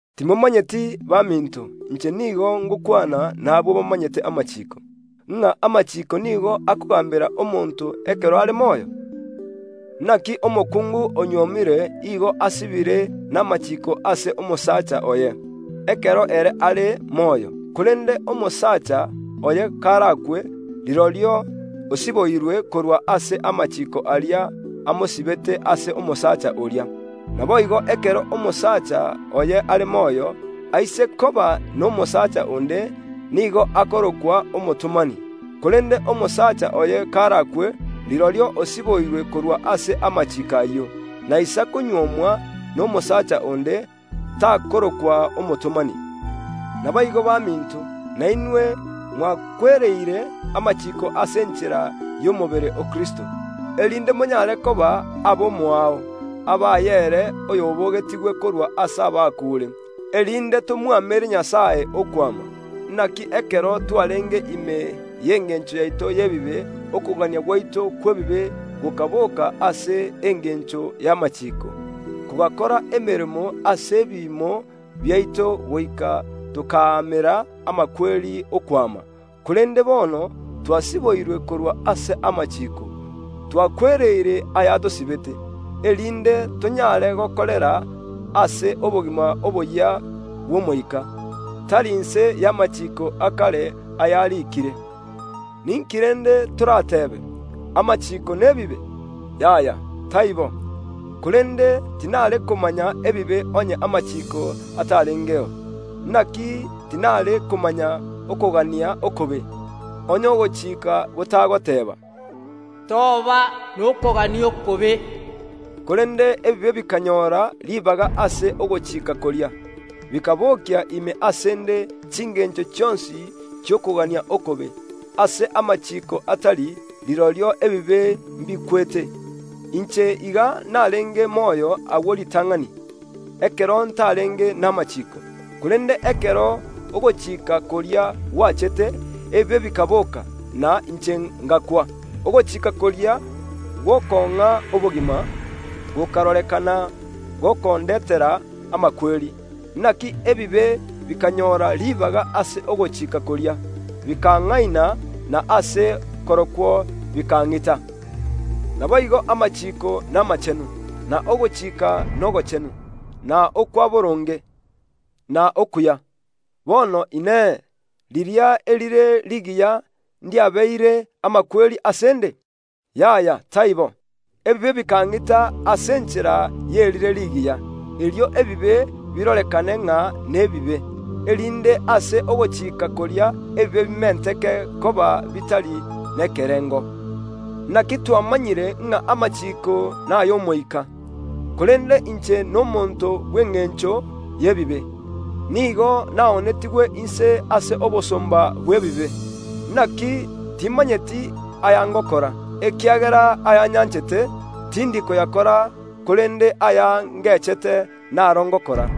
Timomanyeti, baminto (inche nigo ngokwana nabwo bamanyete amachiiko) ng’a amachiiko nigo akogaambera omonto ekero are moyo? Inaki omokungu onyuomire igo asibire n’amachiiko ase omosacha oye, ekero ere are moyo, korende omosacha oye karakwe, rirorio osiboirwe korwa ase amachiiko aria amosibete ase omosacha oria. Naboigo ekero omosacha oye are moyo, aise koba nomosaacha onde nigo akorokwa omotomani; korende omosacha oye karakwe, rirorio osiboirwe korwa ase amachiiko ayio. Naisa konyuomwa nomosaacha onde, takorokwa omotomani. Naboigo baminto, nainwe mwakwereire amachiiko ase enchera y’omobere o Kristo, erinde monyare koba ab’omoao, abaye ere oy’obogetigwe korwa ase abakuure, erinde tomwamere Nyasae okwama. Inaki ekero twarenge ime y’engencho yaito y’ebibe okogania gwaito kw’ebibe gokabooka ase engencho y’amachiiko, kogakora emeremo ase ebiimo biaito goika tokaamera amakweri okwama. Korende bono twasiboirwe korwa ase amachiiko, twakwereire ay’atosibete, erinde tonyare gokorera ase obogima oboyia bw’Omoika, tari inse y’amachiiko a kare ayariikire. Ninki rende torateebe? Amachiiko n’ebibe? Yaya, taibo! Korende tinare komanya ebibe onye amachiiko atarengeo; inaki tinare komanya okogania okobe, onye ogochika gotagoteeba, “Toba nokogania okobe.” Korende ebibe bikanyora ribaga ase ogochika koria, bikabokia ime ase ’nde chingencho chionsi chi’okogania okobe. Ase amachiiko atari, rirorio ebibe mbikwete. Inche iga narenge moyo agwo ritang’ani ekero ntarenge n’amachiiko, korende ekero ogochika koria gwachete, ebibe bikaboka, na inche ’ngakwa. Ogochika koria gw’okong’a obogima, gokarorekana gokondetera amakweri. Inaki ebibe bikanyora ribaga ase ogochika koria, bikang’aina, na ase korokwo bikang’ita. Naboigo amachiiko namachenu, na ogochika nogochenu, na okwa boronge, na okuya. Bono inee, riria erire rigiya ndiabeire amakweri ase ’nde? Yaya, taibo! Ebibe bikang’ita ase enchera y’erire rigiya, erio ebibe birorekane ng’a nebibe, erinde ase ogochika koria ebibe bimenteke koba bitari nekerengo. Inaki twamanyire ng’a amachiiko nay’Omoika, korende inche n’omonto bw’engencho y’ebibe; nigo naonetigwe inse ase obosomba bw’ebibe. Inaki timanyeti aya ngokora, ekiagera aya nyanchete, tindi koyakora, korende aya ngechete naro ngokora.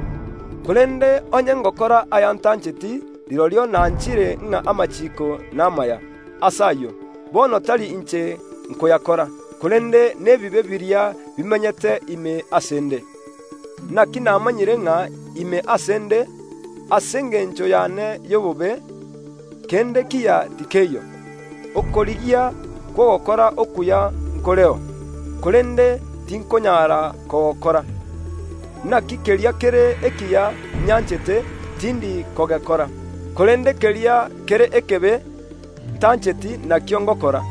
Korende onye ngokora aya ntancheti, rirorio nanchire ng’a amachiiko n’amaya. Ase ayio, bono tari inche nkoyakora, korende n’ebibe biria bimenyete ime ase ’nde. Inaki namanyire ng’a ime ase ’nde, ase engencho y’ane y’obobe, kende kiya tikeiyo; okorigia kw’ogokora okuya nkoreo, korende tinkonyara kogokora. Inaki keria kere ekiya nyanchete, tindi kogekora, korende keria kere ekebe ntancheti, nakio ngokora.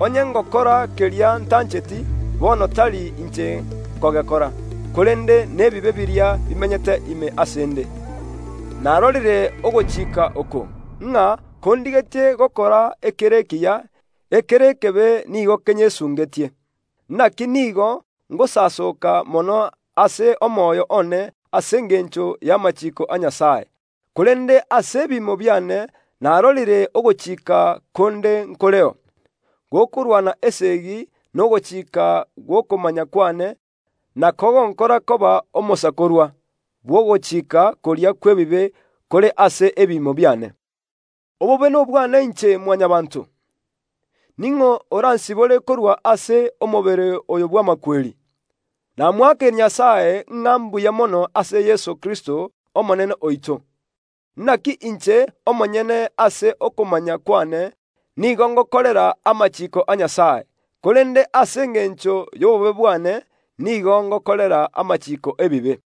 Onye ngokora keria ntancheti, bono tari inche nkogekora, korende n’ebibe biria bimenyete ime ase ’nde. Narorire ogochika oko, ng’a kondigetie gokora ekere ekiya, ekere ekebe nigo kenyesungetie. Inaki nigo ngosasoka mono ase omoyo one ase engencho y’amachiiko a Nyasae, korende ase ebiimo biane narorire ogochika konde nkoreo, gokorwana esegi n’ogochika gw’okomanya kw’ane na kogonkora koba omosakorwa bw’ogochika koria kw’ebibe kore ase ebiimo biane. Obobe nobwane inche Mwanyabaanto! Ning’o oransibore korwa ase omobere oyo bw’amakweri? Namoakeire Nyasae ng’a mbuya mono ase Yeso Kristo Omonene oito! Inaki inche omonyene ase okomanya kw’ane nigo ngokorera amachiiko a Nyasae, korende ase engencho y’obobe bwane nigo ngokorera amachiiko y’ebibe.